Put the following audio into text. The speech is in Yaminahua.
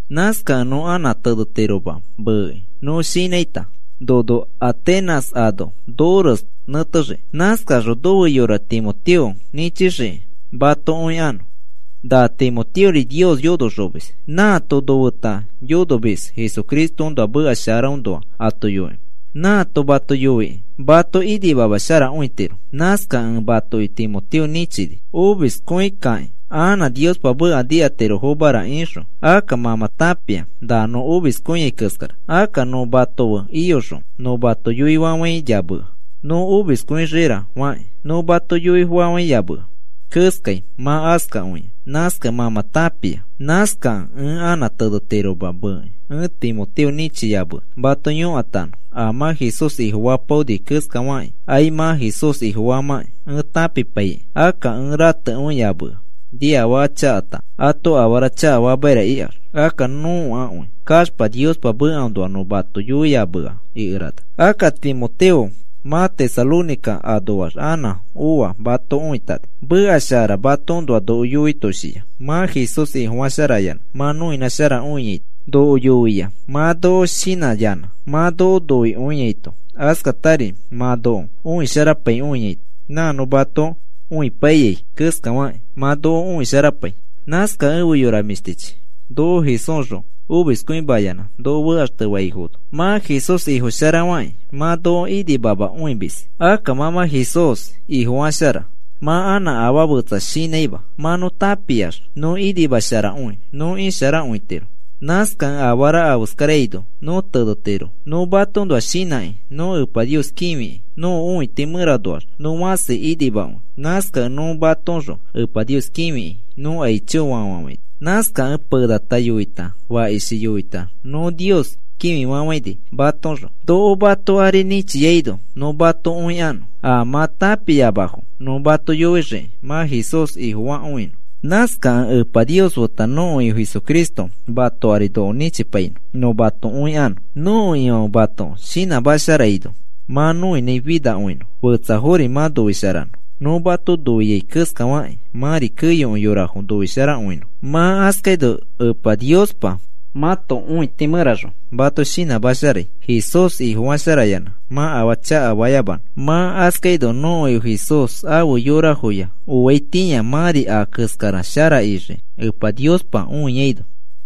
Nãskakẽ nõ anã tenetiroma meekĩ nõ shinãita nono Atenas ano nores nẽtexiki, nãskaxõ nofe yora Timoteo nĩchixiki mato õikanõ. Na Timoteori Nios yonoxomis, nãato nofeta yonomis Jesucristoõnoa meka sharaõnoa ato yoikĩ. Nãato mato yoikĩ mato inimamasharakõitiro. Nãskakẽ ẽ matoki Timoteo nĩchini: “Omiskõikãki anã Niospa meka nikatirofomara,” ixõ. Akka mã mã tãpia na nõ omiskõiai keskara. Akka nõ mato fe iyoxõ, nõ mato yoifafãiyamea, nõ omiskõixiira fakĩ. Nõ mato yoifafãiyamea keskai mã askakõia, nãskakẽ mã mã tãpia. Nãskakẽ ẽ anã tenetiroma meekĩ, ẽ Timoteo nĩchiyamea mato yõkatanõ, a mã Jesús Ifofapaoni keskafakĩ ai mã Jesús Ifofamãkĩ ẽ tãpipaikĩ. Akka ẽ ratekõiyamea, “Niafaka chakata ato afara chakafamaira,” ikax. Akka nõakõi kaxpa Niospa mekaõnoa nõ mato yoiyamea ikerana. Akka Timoteo mã Tesalónica anoax anã oa mato õitani. Meka shara matoõnoa noko yoitoshia, mã Jesús Ifofasharayanã mã noinãsharakõiaito. Noko yoia mã noko shinãyanã mã noko noikõiaito, askatari mã noko õisharapaikõiaito, nã nõ mato õipaiyai keskafakĩ mã noko õisharapai. Nãskakẽ efe yora mĩshtichi, noko Jesúsxõ omiskõimayanã noko fekaxtefaifono mã Jesús Ifo sharafakĩ mã noko inimamakõimis. Akka mã mã Jesús Ifofashara, mã anã afaa fetsa shinãima. Mã nõ tãpiax nõ inimasharakõi nõ isharakõitiro. Nãskakẽ afara afeskaraino nõ tenetiro. Nõ matoõnoa shinãki nõ Epa Nios kĩfikĩ, nõko õiti mẽranoax nõ fãsi inimakõi. Nãskakẽ nõ matoõxõ Epa Nios kĩfiki nõ aichofa fafafãini. Nãskakẽ penata yoita fakishi yoita nõ Nios kĩfifafãini matoõxõ, noko mato ari nĩchiaino nõ mato õikanõ a mã tãpiamafo nõ mato yoixiki mã Jesús Ifofakõinõ. Nãskakẽ Epa Nios feta nõko Ifo Jesucristo mato ari noko nĩchipainõ nõ mato õikanõ. Nõko Ifãfe mato shinãmasharaino mã noinãi finakõinõ, fetsafori mã noisharanõ, nõ mato noiai keskafakĩ mãri keyokõi yorafo noisharakõinõ. Mã askaino Epa Niospa mãto õiti mẽraxõ mato shinãmasharai, Jesús Ifo sharafayanã mã afaa chakafayamanõ. Mã askaino nõko Ifo Jesús afe yorafoya oaitĩa mãri a keskara shara ixii, Epa Niospa õiaino.